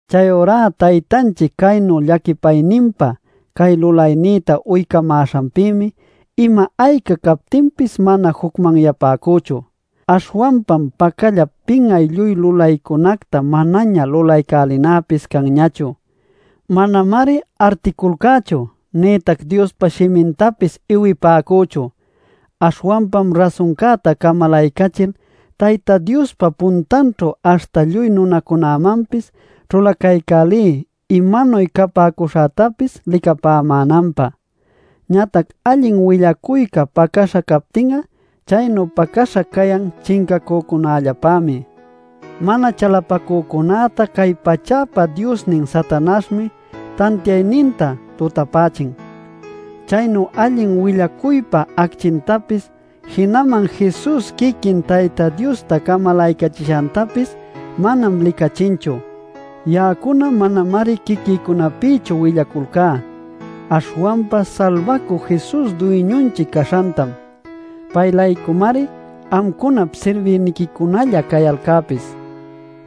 Chayurá Taytanchic chaynu llaquipayninpa cay lulaynïta uycamäśhanpïmi ima ayca captinpis mana jucmanyapäcüchu. Aśhwanpam pacallap pin'ay lluy lulaycunacta manaña lulaycälinäpis canñachu. Manamari articulcächu nïtac Diospa shimintapis iwipäcüchu. Aśhwanpam rasuncäta camalaycachil Tayta Diospa puntanćhu aśhta lluy nunacunämanpis ćhulacaycälí imanuy capäcuśhätapis licapämänanpä. Ñatac allin willacuyca pacäśha captin'a, chaynu pacäśha cayan chincacücunällapämi. Mana chalapacücunäta cay pachäpa diosnin Satanaśhmi tantiayninta tutapächin. Chaynu allin willacuypa acchintapis, jinaman Jesus quiquin Tayta Diosta camalaycachishantapis manam licachinchu. Ya'acuna manamari quiquïcunapïchu willaculcá, aśhwanpa Salbacü Jesus Duyñunchic caśhantam; pay-laycumari amcunap sirbïniquicunalla cayalcäpis.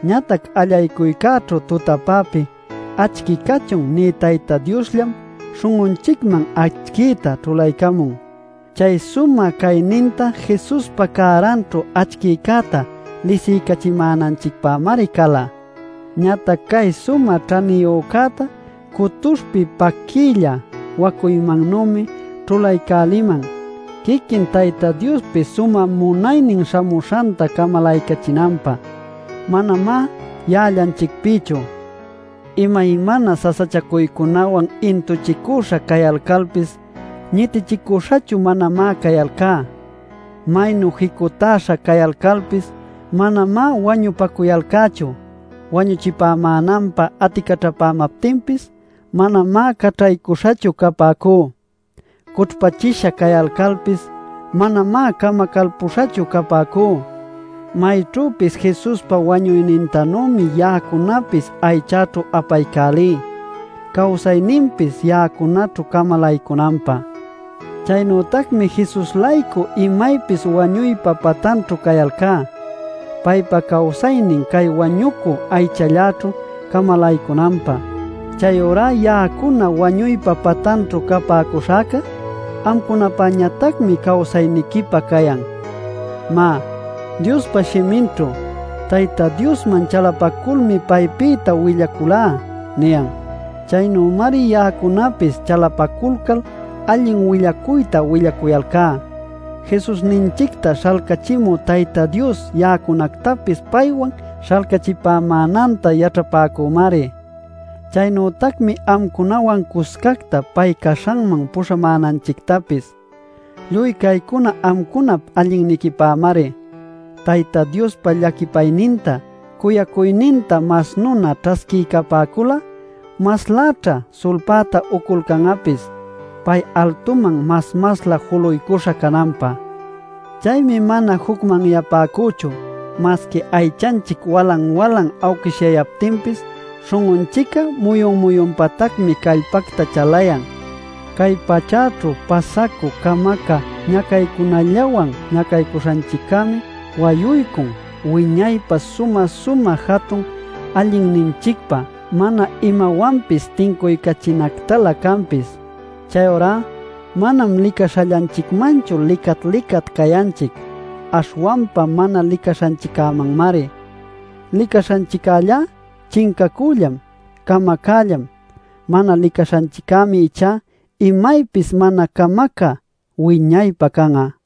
Ñatac allaycuycäćhu tutapäpi “Acchi cachun” nï Tayta Diosllam śhun'unchicman acchïta ćhulaycamun. Chay sumä cayninta Jesuspa cäranćhu acchiycäta lisiycachimänanchicpämari cala. Ñatac cay sumä ćhaniyücäta cutuśhpi paquïlla wacuymannümi ćhulaycäliman quiquin Tayta Diospi sumä munaynin śhamuśhanta camalaycachinanpä; manamá ya'allanchicpïchu. Imaymana sasachacuycunawan intuchicüśha cayalcalpis, ñitichicuśhachu manamá cayalcá. Maynu jicutäśha cayalcalpis, manamá wañupacuyalcächu. Wañuchipämänanpä aticaćhapämaptinpis, manamá caćhaycuśhachu capäcú. Cućhpächisha cayalcalpis, manamá camacalpüśhachu capäcú. Mayćhüpis Jesuspa wañuynintanümi ya'acunapis aychäćhu apaycälí cawsayninpis ya'acunaćhu camalaycunanpä. Chaynütacmi Jesus-laycu imaypis wañuypa patanćhu cayalcá, paypa cawsaynin cay wañucü aychalläćhu camalaycunanpä. Chayurá ya'acuna wañuypa patanćhu capäcuśhäcá amcunapäñatacmi cawsayniquipä cayan. Má, Diospa shiminćhu: “Tayta Diosman chalapaculmi paypïta willaculá” niyan. Chaynümari ya'acunapis chalapaculcal allin willacuyta willacuyalcá. Jesusninchicta śhalcachimü Tayta Dios ya'acunactapis paywan śhalcachipämänanta yaćhapäcümari; chaynütacmi amcunawan cuscacta pay caśhanman puśhamänanchictapis. Lluy caycuna amcunap allinniquipämari; Tayta Diospa llaquipayninta cuyacuyninta mas nuna ćhasquiycapäcul'a, masläćha sulpäta uculcan'apis pay altuman mas-maslä juluycuśha cananpä. Chaymi mana jucmanyapäcüchu. Masqui aychanchic walan-walan awquishyayaptinpis, śhun'unchic'a muyun-muyunpatacmi callpacta chalayan. Cay pachäćhu pasacü camacä ñacaycunällawan ñacaśhanchiccämi wayuycun wiñaypä sumä-sumä jatun allinninchicpä mana imawanpis tincuycachinactalä canpis. Chayurá manam licaśhallanchicmanchu licat-licat cayanchic, aśhwanpa mana licaśhanchiccämanmari. Licaśhanchiccällá chincacüllam, camacällam. Mana licaśhanchiccämi ichá imaypis mana camacä wiñaypä can'a.